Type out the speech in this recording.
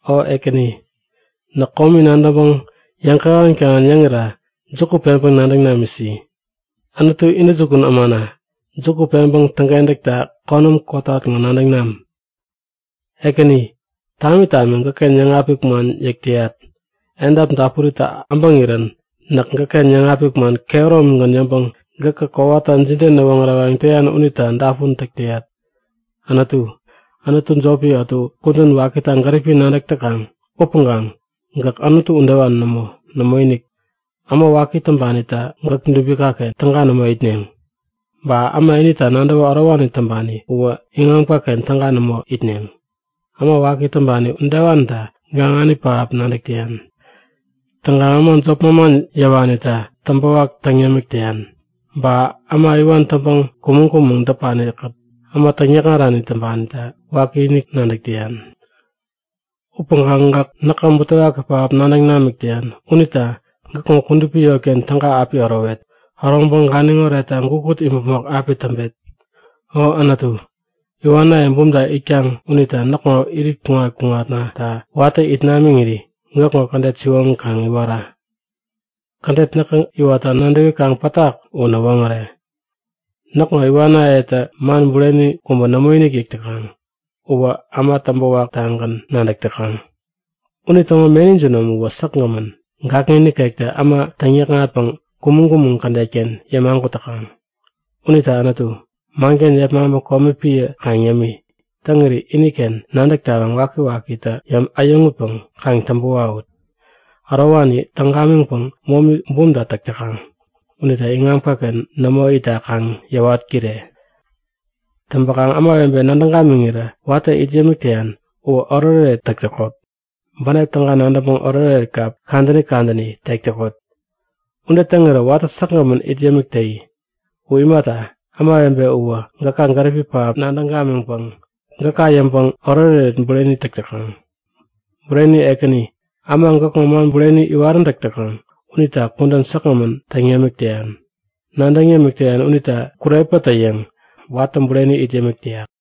O Ekäni, näk komi nadäŋpäŋ yäŋkähän-kähän yäŋira juku peŋpäŋ nadäŋ namisi. Anutu intäjukun ämana, juku peŋpäŋ täŋkentäkta konäm kotat ŋo nadäŋ nam. Ekäni, tami tami gäkken yäŋapik man yäk täyat. Edap dapuritä abäŋirän näk gäkken yäŋapik man kehäromigän yäŋpäŋ gäkä kowata jide näwoŋärewayäŋ täyan unita dapun täk täyat. Anutu, anutu jopi ätu kudän wakita gäripi nadäk täkaŋ upäŋkaŋ gäk anutu udewani nämo. Nämoinik, äma waki täŋpanitä gäk dubikaken täga nämo itneŋ. Ba äma inita nadäwä ärowani täŋpani uwä iŋamkaken täga nämo itneŋ. Äma waki täŋpani udewanita gaŋani pähap nadäk täyan. Täŋkaŋ äma jop manman yäwanita täŋpäwak täŋ yämik täyan. Ba äma iwan täŋpäŋ kumäŋ-kumäŋ däpanikät äma täŋyäkŋarani täŋpanita wakiinik nadäk täyan. Upäŋkaŋ gäk näka butewaki pähap nadäŋ namik täyan unita gäkŋo kudupi yotken täga api ärowet. Äroŋpäŋ ganiŋ oretta gukut imäpmok api täŋpet. O Anutu, iwanaye bumta itkaŋ unita näkŋo irit kuŋat-kuŋatnata watä it namiŋiri gäkŋo kädet siwoŋi kaŋ iwara. Kädet näkä iwatta nadäwikaŋ pätak u näwoŋäre. Näkŋo iwanayetä man bureni kubä nämoinik yäk täkaŋ. Uwä äma täŋpä waktagän nadäk täkaŋ. Unitäŋo meni jinom uwä säkgämän, gakŋi nikektä äma täŋyäkŋatpäŋ kumäŋ-kumäŋ kädetken yämagut täkaŋ. Unita Anutu, manken yepmaŋpäŋ komi piä kaŋ yämi. Täŋiri iniken nadäk tawaŋ wakiwakitä äyäŋutpäŋ kaŋ täŋpä wawut. Ärowani täŋ gamiŋpäŋ momi bumta täk täkaŋ unita iŋamkaken nämo itta kaŋ yäwat-kire! Täŋpäkaŋ ämawebe nadäŋ gamiŋirä watä it yämik täyan uwä oretoret täk täkot. Bänep täga nadäŋpäŋ oretoret kap kadäni kadäni tek täkot. Ude täŋirä watä säkgämän it yämik täyi. U imata, ämawebe uwä gäka gäripi pähap nadäŋ gamiŋpäŋ gäka yäŋpäŋ oretoret bureni täk täkaŋ. Bureni Ekäni, äma gäkŋo man bureni iwaräntäk täkaŋ unita kudän säkgämän täŋ yämik täyan. Nadäŋ yämik täyan unitä kurepätä-yäŋ watä bureni it yämik täyak.